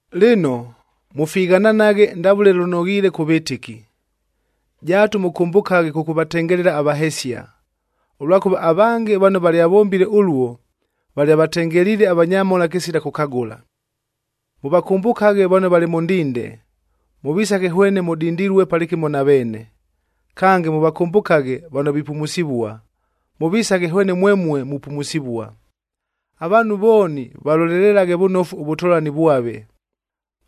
Lɨno, mʉfighananaghe ndavʉle lʉnoghiile kʉ vɨtɨki. Jaatu mʉkʉmbʉkaghe kʉkʉvatengelela avahesia, ʉlwakʉva avange vano valyavombile ʉluo, valyavatengeliile avanyamhola kɨsila kʉkagʉla. Mʉvakʉmbʉkaghe vano valɨ mʉ ndinde, mʉvisaghe hwene mʉdindilue palɨkɨmo na veene. Kange, mʉvakʉmbʉkaghe vano vipumusivua, mʉvisaghe hwene mwemue mupumusivua. Avaanhu vooni valolelelaghe vʉnofu ʉvʉtolani vwave,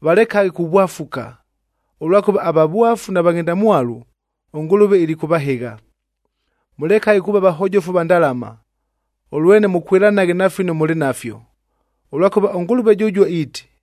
valekaghe kuvwafuka, ʉlwakʉva avavwafu na vaghendamwalu, ʉNgʉlʉve ilikʉvahɨgha. Mʉlekaghe kuuva vahojofu va ndalama, ʉlwene mʉkwɨlanaghe na fino mʉlɨ nafyo, ʉlwakʉva ʉNgʉlʉve jʉjuo iiti,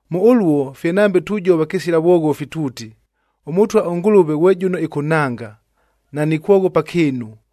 Mʉ ʉluo, fye nambe tujova kɨsila vwoghofi tuuti, “ɄMʉtwa ʉNgʉlʉve ghwe jʉno ɨkʉnhanga, nanikwoghopa kɨɨnu.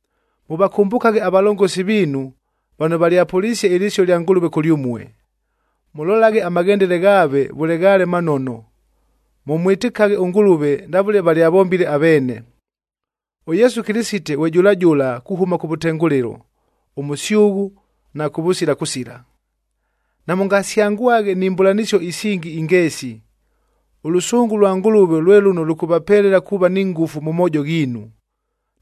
Mʉvakʉmbʉkaghe avalongosi viinu vano valyapʉlisie ɨlɨsio ɨlya Ngʉlʉve kʉlyʉmue, mʉlolaghe amaghendele ghaave vʉle ghaale manono, mʉmwɨtɨkaghe ʉNgʉlʉve ndavʉle valyavombile aveene. ɄYesu Kɨlɨsite ghwe jʉla jʉla kuhʉma kʉvʉtengʉlɨlo, ʉmʉsyʉghʉ na kʉvʉsila kʉsila. Namʉngasyangwaghe ni mbʉlanɨsio isingi ingeesi. Ʉlʉsʉngʉ lwa Ngʉlʉve lwe lʉno lʉkʉvapelela kuuva ni ngʉfu mʉ moojo ghiinu,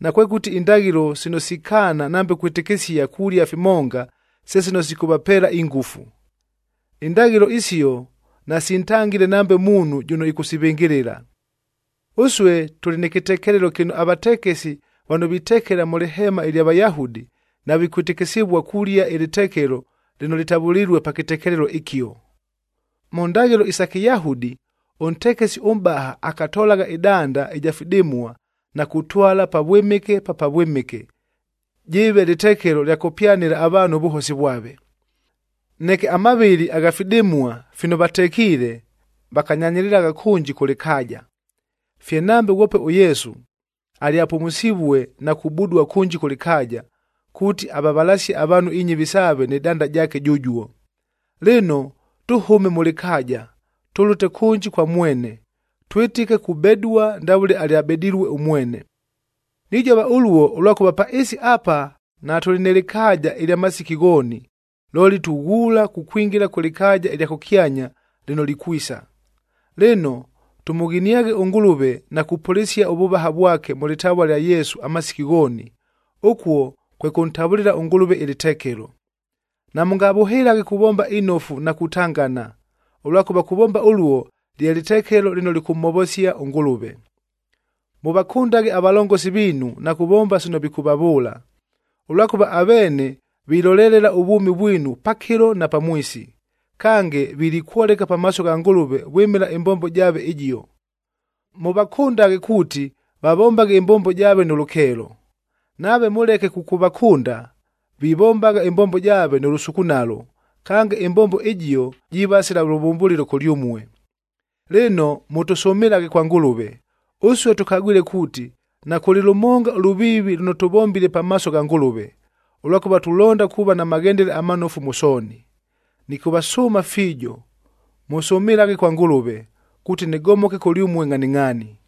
nakwekʉti indaghɨlo sino sikaana nambe kwɨtɨkɨsia kulia fimonga se sino sikʉvapeela ingʉfu. Indaghɨlo isio nasintangile nambe muunhu jʉno ɨkʉsivɨngɨlɨla. Ʉsue tʉlɨ nɨ kɨtekelelo kɨno avatekesi vano vitekela mʉ lɨheema ɨlya Vayahudi, navikwɨtɨkɨsɨvua kulia ɨlɨtekelo lɨno lɨtavʉlilue pa kɨtekelelo ɨkio. Mʉ ndaghɨlo isa Kɨyahudi, ʉntekesi ʉmʼbaha akatolagha ɨdanda ɨja fidɨmua na kutwala Pavwɨmɨke pa Pavwɨmɨke, jɨɨve lɨtekelo lya kʉpyanɨla avaanhu ʉvʉhosi vwave. Neke amavɨlɨ agha fidɨmua fino vatekiile vakanyanyɨlɨlagha kʉnji kʉ lɨkaaja. Fye nambe ghwope ʉYesu alyapumusivue na kubudua kʉnji kʉ lɨkaaja, kuuti avavalasie avaanhu inyɨvi saave nɨ danda jaake jʉjuo. Lɨno, tʉhʉme mʉ lɨkaaja, tʉlʉte kʉnji kwa mwene, twɨtɨke kubedua ndavʉle alyabedilue ʉmwene. Nijova ʉluo, ʉlwakʉva pa ɨɨsi apa natʉlɨ nɨ lɨkaaja ɨlya masiki ghooni, looli tughuula kukwingila kʉ lɨkaaja ɨlya kʉkyanya lɨno likwisa. Lɨno, tʉmʉghiniaghe ʉNgʉlʉve na kupʉlɨsia ʉvʉvaha vwake mʉ lɨtavua lya Yesu amasiki ghooni, ʉkuo kwe kʉntavʉlɨla ʉNgʉlʉve ɨlɨtekelo. Namʉngavʉhɨlaghe kuvomba inofu na kutangana, ʉlwakʉva kuvomba ʉluo, lye lɨtekelo lɨno lɨkʉmhovosia ʉNgʉlʉve. Mʉvakʉndaghe avalongosi viinu na kuvomba sino vikʉvavʉʉla, ʉlwakʉva aveene vilolelela ʉvwʉmi vwinu pakɨlo na pamwisi, kange vilikwoleka pamaaso gha Ngʉlʉve vwɨmɨla ɨmbombo jaave ɨjio. Mʉvakʉndaghe kuuti vavombaghe ɨmbombo jaave nʉ lʉkeelo. Nave mʉleke kʉkʉvakʉnda, vivombagha ɨmbombo jaave nʉ lʉsukunalo, kange ɨmbombo ɨjio, jiiva sila lʉvʉmbʉlɨlo kʉlyʉmue. Lɨno, mʉtʉsʉmɨlaghe kwa Ngʉlʉve. Ʉsue tʉkagwile kuuti nakʉlɨ lʉmonga ʉlʉviivi lʉno tʉvombile pamaaso gha Ngʉlʉve, ʉlwakʉva tulonda kuuva na maghendele amanofu mʉ sooni. Nɨkʉvasʉʉma fiijo, mʉsʉmɨlaghe kwa Ngʉlʉve, kuuti nɨgomoke kʉlyʉmue ngʼhaningʼhaani.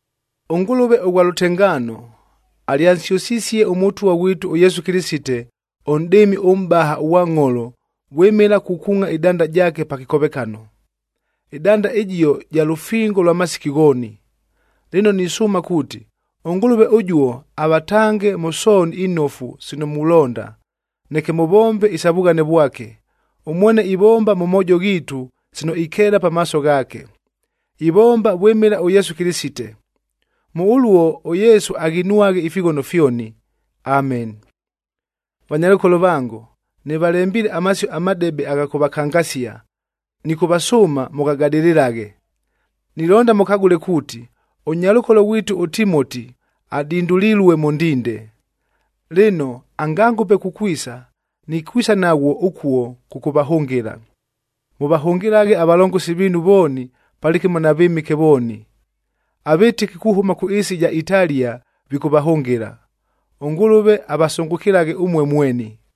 ɄNgʉlʉve ʉghwa lʉtengaano, alyansyʉsisie ʉMʉtwa ghwitu ʉYesu Kɨlɨsite, ʉNʼdɨɨmi ʉMʼbaha ʉghwa ngʼholo vwɨmɨla kukuungʼa ɨdanda jaake pa kɨkovekano. Ɨdanda ɨjio ja lʉfingo lwa masiki ghooni. Lɨno nisʉʉma kuuti, ʉNgʉlʉve ʉjuo avatange mʉ sooni inofu sino mulonda, neke mʉvombe isa vughane vwake. Ʉmwene ivomba mʉ moojo ghiitu sino ikeela pamaaso ghaake. Ivomba vwɨmɨla ʉYesu Kɨlɨsite. Mʉ ʉluo ʉYesu aghinwaghe ifighono fyoni. Ameni. Vanyalʉkolo vango, nɨvalembiile amasio amadebe agha kʉvakangasia, nɨkʉvasʉʉma mʉghagadɨlɨlaghe. Nilonda mʉkagʉle kuuti, ʉnyalʉkolo ghwitu ʉTimoti adindulilue mʉ ndinde. Lɨno, angangʉpe kukwisa, nikwisa naghwo ʉkuo kʉkʉvahʉngɨla. Mʉvahʉngɨlaghe avalongosi viinu vooni palɨkɨmo na vɨmɨke vooni. Avɨtɨki kuhʉma kʉ ɨɨsi ɨja Italia vikʉvahʉngɨla. ɄNgʉlʉve avasʉngʉkɨlaghe ʉmue mweni.